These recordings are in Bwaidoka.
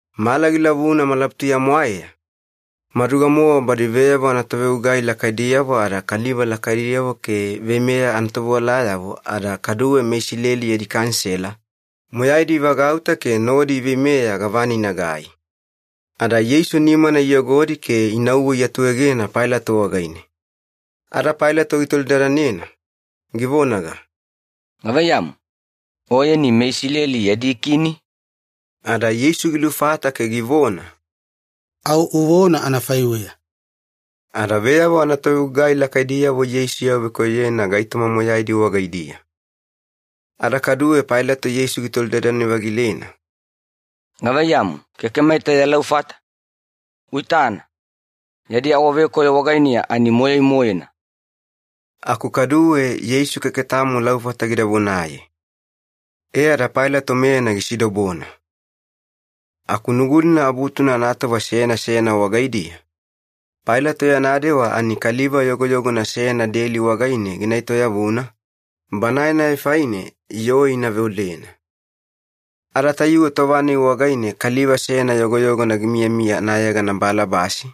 Mala gilavuna malabutuya-mwaeya, maduga-mowa badi veyavo anatovegugai lakaidiyavo ada kaliva lakaidiyavo ke veimeya anatovewalayavo ada kaduwe meIsileli yadi Kanisela, moyaidi ivagauta ke nodi iveimeya gavana inagai. Ada Yeisu nimana iyogodi ke inauwe iatuegena Pailato wagaine. Ada Pailato gitolidadanena, givonaga, “Gavaiyamu, Oyeni meIsileli yadi Kini?” Ada Yeisu gilufata ke givona, “Au uvona anafaiweya.” Ada veyavo anatovegugai lakaidiyavo Yeisu iawavekoyoyena gaitoma moyaidi wagaidiya. Ada kaduwe Pailato Yeisu gitolidadane-vagilena, “Gavaiyamu, keke maita ya laufata? Uitana, yadi awavekoyo wagainiya ani moyai-moena.” Aku kaduwe Yeisu keke tamo laufata gida vonaye. E ada Pailato meyana gisidobona. Aku Nugulina Abutuna anatova seyana seyana wagaidiya, Pailato yana dewa ani kaliva yogoyogona seyana deli wagaine gina etoyavuna, banae-nai faine yoo ina veolena. Ada tayuwe tova-nai wagaine kaliva seyana yogoyogona gimiyamiya anayegana Balabasi,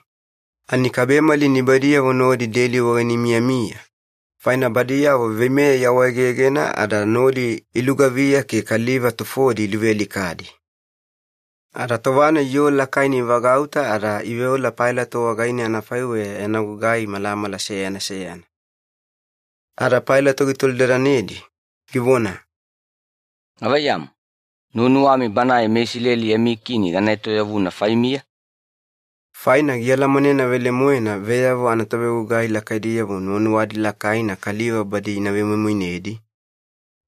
ani kabemali nibaidiyavo nodi deli wagaine imiyamiya, faina badiyavo veimeya iawaegegena ada nodi ilugaviya ke kaliva tufodi iluvealikadi. Ada tova-nai yoo lakaina ivagauta ada iveola Pailato wagaine anafaiweya yana gugai malamala seyana seyana. Ada Pailato gitolidadanedi, givona, “Gavaiyamu, nuwanuwami Banae meIsileli yami Kini gana etoyavuna faimiya?” Faina gialamanena velemoena veyavo anatovegugai lakaidiyavo nuwanuwadi lakaina kaliva badi ina vemoimoinedi,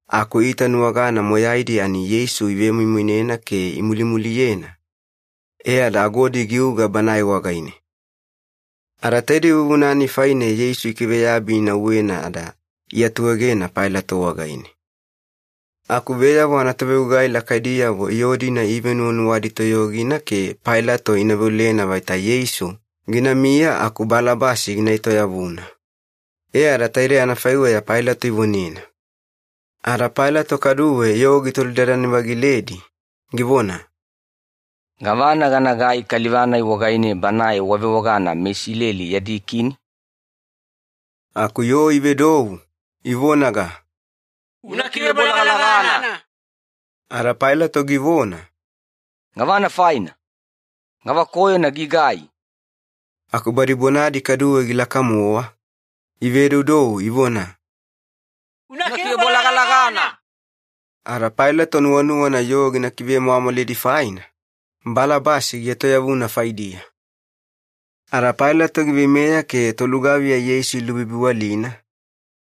aku iitanuwagana moyaidi ani Yeisu ivemoimoinena ke imulimuliyena, e ada agodi giuga Banae wagaine. Ada taide vuvuna-nai faine Yeisu ikiveyabi inauwena ada iatuegena Pailato wagaine. Aku veyavo anatovegugai lakaidiyavo yoo-dina iivenuwanuwadi toyogina ke Pailato ina veolena vaita Yeisu ginamiya aku Balabasi gina etoyavuna. E ada taidei anafaiweya Pailato ivonena. Ada Pailato kaduwe yoo gitolidadane-vagiledi, givona, “Gavana ganagai kaliva-nai wagaine banae wavewagana ‘MeIsileli yadi Kini’?” Aku yoo ivedou, ivonaga, “Una kivebolagalagana!” Ada Pailato givona, “Gavana faina? Gavakoyona gigai?” Aku badi bonadi kaduwe gilaka-mowa, ivedoudou ivona, “Una kivebolagalagana!” Ada Pailato nuwanuwana yoo gina kivemwamwalidi faina, Balabasi gietoyavuna faidiya. Ada Pailato giveimeya ke tolugaviya Yeisu ilubibiwalina,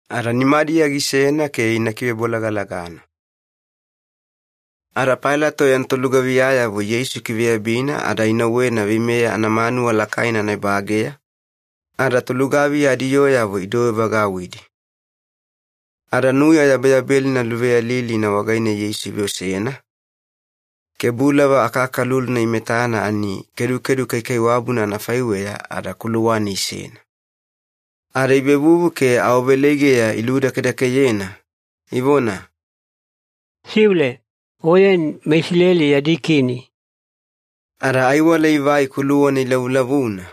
ada nimadiya gisena ke ina kivebolagalagana. Ada Pailato yana tolugaviyayavo Yeisu ikiveyabina ada inauwena veimeya anamanuwa lakaina anaebageya, ada tolugaviya adiyooyavo idouwevagauwidi. Ada nuya yabeyabelina luveyalilina wagaine Yeisu iveosena, ke bulava akakaluluna imetana ani kedukedu kaikaiwabuna anafaiweya ada kuluwane isena. Ada ivevuvu ke awaveleigeya iludakedakeyena, ivona, “Siule! Oyeni meIsileli yadi Kini!” Ada aiwala ivai kuluwana ilavulavuna,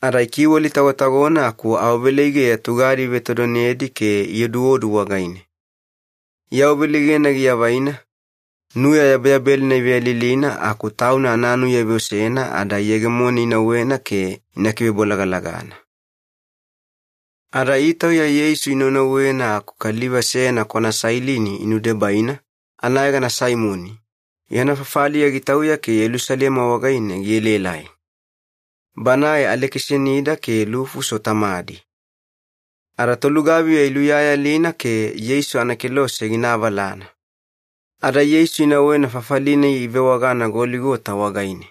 ada ikiwalitagotagona aku awaveleigeya tugadi ivetodonedi ke ioduodu wagaine. Iawaveleigena giavaina, nuya yabeyabelina iveyalilina aku tauna ananuya iveosena ada iyegemone inauwena ke ina kivebolagalagana. Ada itauya Yeisu inaunauwena aku kaliva seyana kwana Sailini inudebaina, anayegana Saimoni. Yana fafaliya gitauya ke Yelusalema wagaine gielaelai. Banae Alekisanida ke Lufuso tamadi. Ada tolugaviya iluyayalina ke Yeisu anakelose gina avalana. Ada Yeisu inauwena fafali-nai ivewagana Goligota wagaine.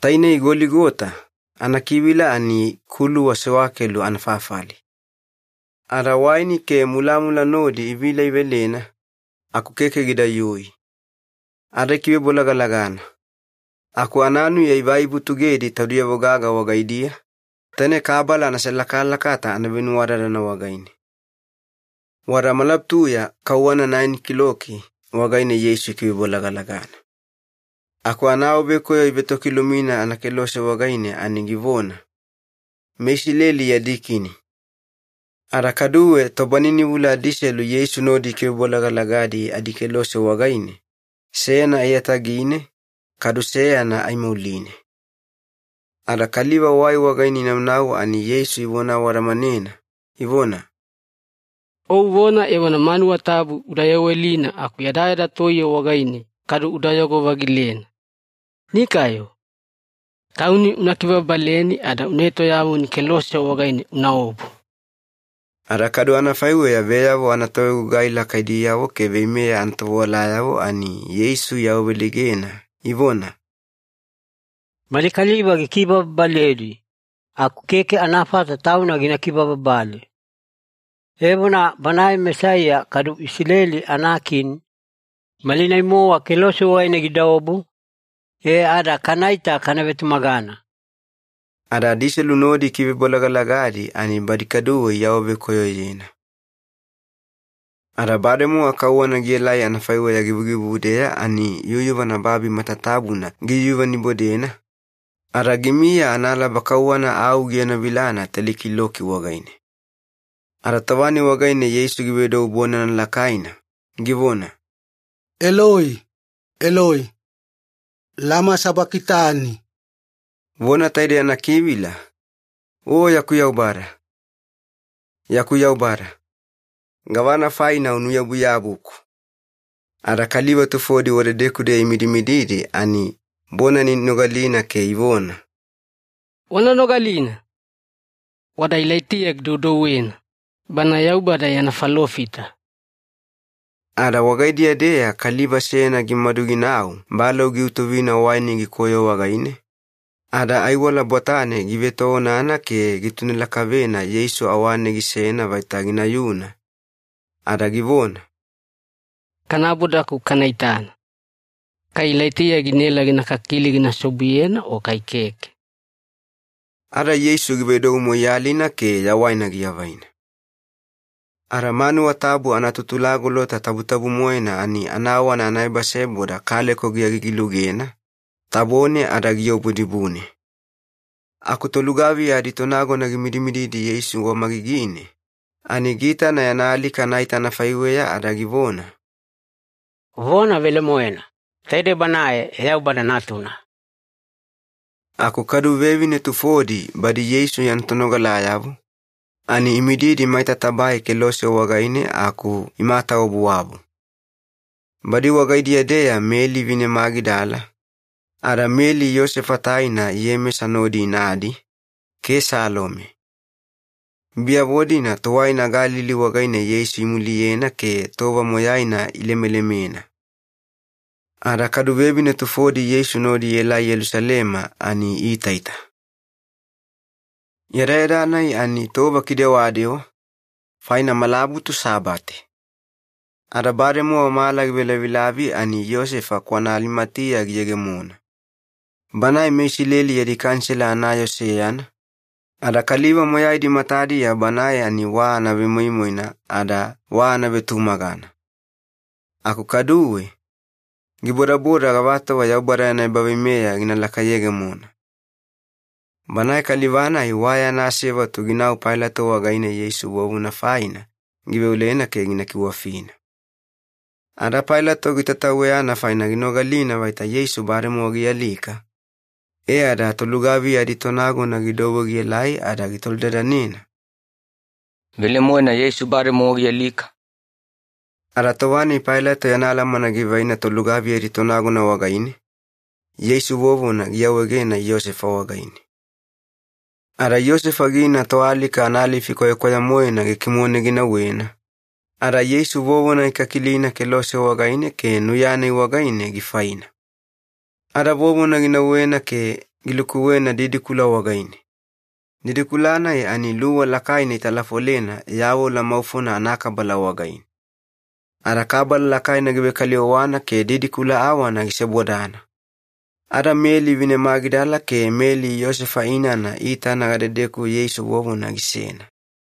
Tainei ‘Goligota’ anakivila ani ‘Kuluwa Sewakelu Anafafali’. Ada waini ke mulamula nodi ivila ivelena, aku keke gidayui. Ada ikivebolagalagana. Aku ananuya ivai ivutugedi taudiyavo gaga wagaidiya, taine kabala anaselakalakata anavenuwadadana wagaine. Wada malabutuya kauwana naeni kiloki wagaine Yeisu ikivebolagalagana. Aku anaawavekoyo ivetokilumina anakelose wagaine ani givona, “MeISILELI YADI KINI.” Ada kaduwe tobaninivula adiselu Yeisu nodi ikivebolagalagadi adikelose wagaine, seyana aiyatagine, kadu seyana aimauline. Ada kaliva wai wagaine inaunau ani Yeisu ivona awadamanena, ivona, “O uvona evona manuwa tabu uda yawelina aku yadayada toiye wagaine kadu udayogo-vagilena. Nikayo! Tauni una kibababaleni ada una etoyavuni kelose wagaine unaobu!” Ada kadu anafaiweya veyavo anatovegugai lakaidiyavo ke veimeya anatovewalayavo ani Yeisu iawaveleigena, ivona, “Mali kaliva gikibababaledi, aku keke anafata Tauna gina kibababale! Evona, Banae Mesaiya kadu Isileli anakini, malinai-mowa kelose wagaine gidaobu, e ada kanaita kana vetumagana!” Ada adiselu nodi ikivebolagalagadi ani badi kaduwe iawavekoyoyena. Ada bademowa kauwana gielai anafaiweya givugivudeya ani yuyuvana babi matatabuna giyuyuvanibodena, ada gimiya analaba kauwana au gienovilana teli kiloki wagaine. Ada tova-nai wagaine Yeisu givedou bonana lakaina, givona, “Eloi, Eloi, lama sabakitani?” Vona taidei anakivila, “O yaku Yaubada, yaku Yaubada, gavana faina unuyabuyabuku?” Ada kaliva tufodi wadedeku-deya imidimididi ani bonana inogalina ke ivona, “Wana nogalina! Wada Ilaitiya gidoudouwena, bana Yaubada yana falofita.” Ada wagaidiya-deya kaliva seyana gimadu ginau balou giutuvina waini gikoyo wagaine, ada aiwala bwatane give etoonana ke gitune lakavena Yeisu awane gisena vaita ginayuna, ada givona, “Kanaboda aku kana itana. Kai Ilaitiya ginaela gina kakili gina seobuyena o kai keke.” Ada Yeisu givedou moiyalina ke yawaina giavaina. Ada manuwa tabu anaTutulagolota Tabutabu-moena ani anawana anaebaseboda kaleko giagigi-lugena, tabone ada giobu dibune. Aku tolugaviya aditonagona gimidimididi Yeisu wamagigine, ani giitana yana alika anaita anafaiweya ada givona, “Vona velemoena, taidei Banae Yaubada Natuna!” Aku kadu vevine tufodi badi Yeisu yana tonogalayavo, ani imididi maita tabae kelose wagaine aku imatawabuwabu. Badi wagaidiya-deya Meli vine Magidala, ada Meli Iyosefa taina Iyemesa nodi inadi, ke Salome. Biyavo-dina tuwaina Galili wagaine Yeisu imuliyena ke tova moyaina ilemelemena. Ada kadu vevine tufodi Yeisu nodi ielai Yelusalema ani iitaita. Yadayada-nai ani Tova Kidewadewa, faina malabutu Sabate. Ada bademowa mala givelavilavi ani Iyosefa kwana Alimatiya giyegemona. Banae meIsileli yadi Kanisela anayoo seyana, ada kaliva moyaidi matadiya banae ani wa anavemoimoina ada wa anavetumagana. Aku kaduwe, gibodaboda gavatova Yaubada yana ebaveimeya gina lakayegemona. Banae kaliva-nai wa yana asevatu ginau Pailato wagaine Yeisu vovona faina giveolena ke gina kiwafina. Ada Pailato gitataweyana faina ginogalina vaita Yeisu bademowa gialika, e ada tolugaviya aditonagona gidouwe gielai ada gitolidadanena, “Velemoena Yeisu bademowa gialika?” Ada tova-nai Pailato yana alamana givaina tolugaviya aditonagona wagaine, Yeisu vovona giawaegena Iyosefa wagaine. Ada Iyosefa gina toalika analifi kwayakwaya-moena gikimone ginauwena, ada Yeisu vovona gikakilina kelose wagaine ke nuya-nai wagaine gifaina. Ada vovona ginauwena ke gilukuwena didikula wagaine. Didikula-nai ani luwa lakaina italafolena yavola maufona anakabala wagaine. Ada kabala lakaina givekaliwawana ke didikula awana gisebodana. Ada Meli vine Magidala ke Meli Iyosefa inana iitana gadedeku Yeisu vovona gisena.